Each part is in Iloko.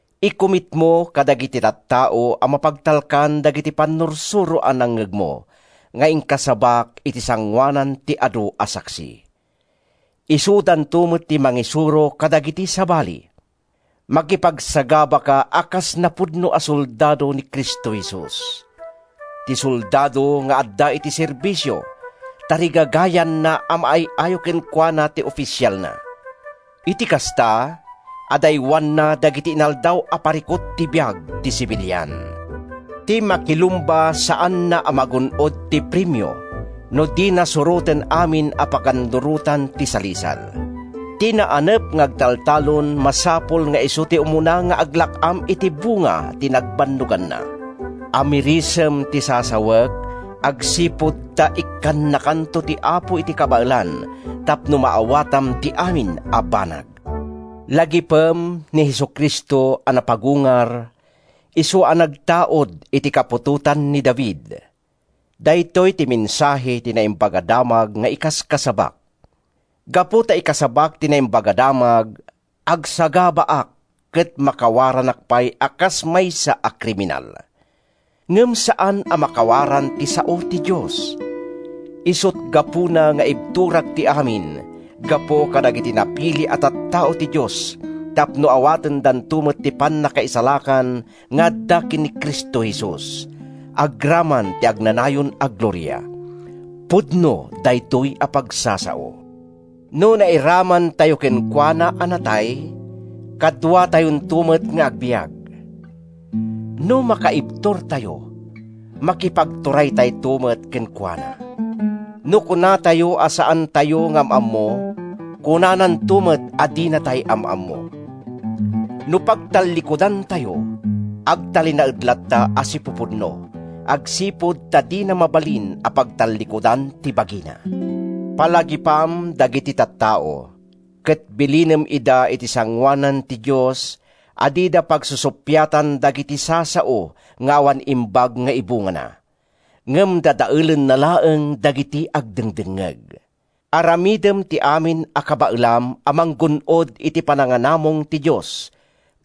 Ikumitmo kadagiti tattao a mapagtalkan dagiti pannursuro a nangngegmo nga inkasabak iti sangoanan ti adu a saksi. Isudanto met ti mangisuro kadagiti sabali. Makipagsagabaka a kas napudno a soldado ni Cristo Jesus. Ti soldado nga adda iti serbisio, tarigagayanna a maay-ayo kenkuana ti ofisialna. Iti kasta, adaywanna dagiti inaldaw a parikut ti biag ti sibilian. Ti makilumba saanna a magun-od ti premio no dina suroten amin a pagannurotan ti salisal. Ti naanep nga agtaltalon masapul nga isu ti umuna nga aglak-am iti bunga ti nagbannoganna. Amirisem ti sasawek agsipud ta ikkannakanto ti Apo iti kabaelan tapno maawatam ti amin a banag. Lagipem ni Jesu-Cristo a napagungar, isu a nagtaud iti kaputotan ni David. Daytoy ti mensahe ti Naimbag a Damag nga ikaskasabak. Gapu ta ikasabak ti Naimbag a Damag, agsagabaak ket makawaranak pay a kas maysa a kriminal. Ngem saan a makawaran ti sao ti Dios. Isut’ gapuna nga ibturak ti amin gapu kadagiti napili a tattao ti Dios tapno awatendanto met ti pannakaisalakan nga adda ken ni Cristo Jesus, agraman ti agnanayon a gloria. Pudno daytoy a pagsasao: “No nairamantayo kenkuana a natay, kaduatayonto met nga agbiag. No makaibturtayo, makipagturaytayto met kenkuana. No kunatayo a saantayo nga am-ammo, kunananto met a dinatay am-ammo. No pagtallikudantayo, agtalinaed latta a sipupudno, agsipud ta dina mabalin a pagtallikudan ti bagina.” Palagipam dagiti tattao, ket bilinem ida iti sangoanan ti Dios a dida pagsusuppiatan dagiti sasao nga awan imbag nga ibungana, ngem dadaelenna laeng dagiti agdengngeg. Aramidem ti amin a kabaelam a manggun-od iti pananganamong ti Dios,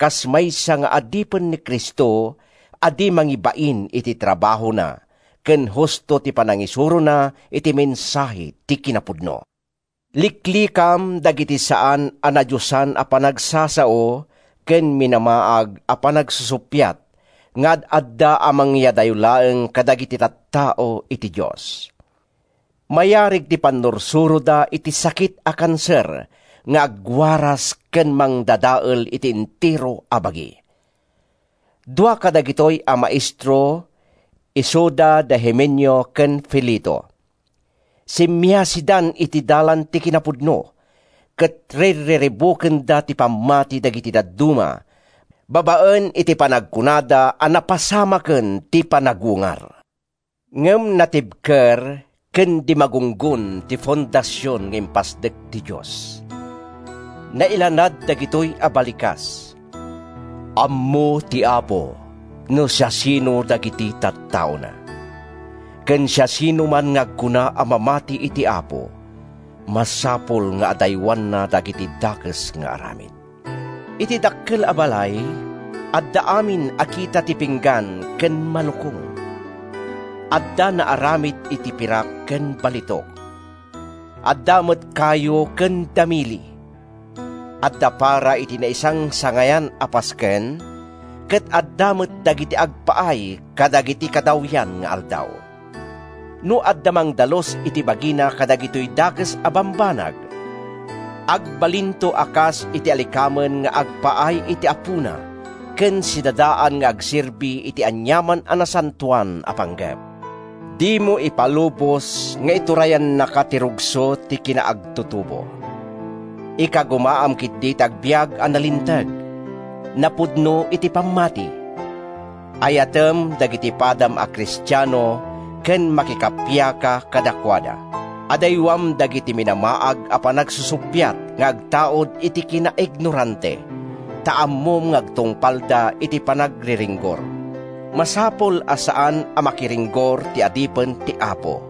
kas maysa nga adipen ni Cristo a di mangibain iti trabahona ken husto ti panangisurona iti mensahe ti kinapudno. Liklikam dagiti saan a nadiosan a panagsasao ken minamaag a panagsusuppiat nga ad-adda a mangyadayo laeng kadagiti tattao iti Dios. Mayarig ti pannursuroda iti sakit a kanser nga agwaras ken mangdadael iti entero a bagi. Dua kadagitoy a maestro isuda da Himeneo ken Fileto. Simmiasidan iti dalan ti kinapudno ket rirriribukenda ti pammati dagiti dadduma babaen iti panagkunada a napasamaken ti panagungar. Ngem natibker ken di magunggon ti fondasion nga impasdek ti Dios. Nailanad dagitoy a balikas: “Ammo ti Apo no siasino dagiti tattaona,” ken “Siasinoman nga agkuna a mamati iti Apo, masapul nga adaywanna dagiti dakes nga aramid.” Iti dakkel a balay, adda amin a kita ti pinggan ken malukong. Adda naaramid iti pirak ken balitok. Adda met kayo ken damili. Adda para iti naisangsangayan a pasken, ket adda met dagiti agpaay kadagiti kadawyan nga aldaw. No adda mangdalus iti bagina kadagitoy dakes a bambanag, agbalinto a kas iti alikamen nga agpaay iti Apona ken sidadaan nga agserbi iti aniaman a nasantoan a panggep. Dimo ipalubos nga iturayannaka ti rugso ti kinaagtutubo. Ikagumaam ketdi ti agbiag a nalinteg, napudno iti pammati; ayatem dagiti padam a Kristiano ken makikappiaka kadakuada. Adaywam dagiti minamaag a panagsusuppiat nga agtaud iti kina-ignorante ta ammom nga agtungpalda iti panagriringgor. Masapul a saan a makiringringgor ti adipen ti Apo.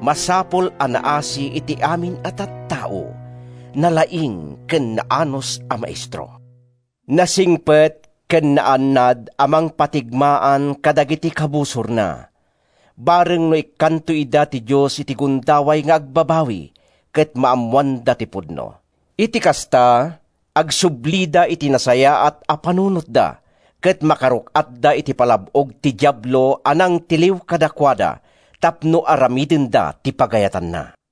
Masapul a naasi iti amin a tattao, nalaing ken naanus a maestro; nasingpet ken naannad a mangpatigmaan kadagiti kabusorna, bareng no ikkanto ida ti Dios iti gundaway nga agbabawi ket maammoanda ti pudno. Iti kasta, agsublida iti nasayaat a panunotda ket makaruk-atda iti palab-og ti Diablo a nangtiliw kadakuada tapno aramidenda ti pagayatanna.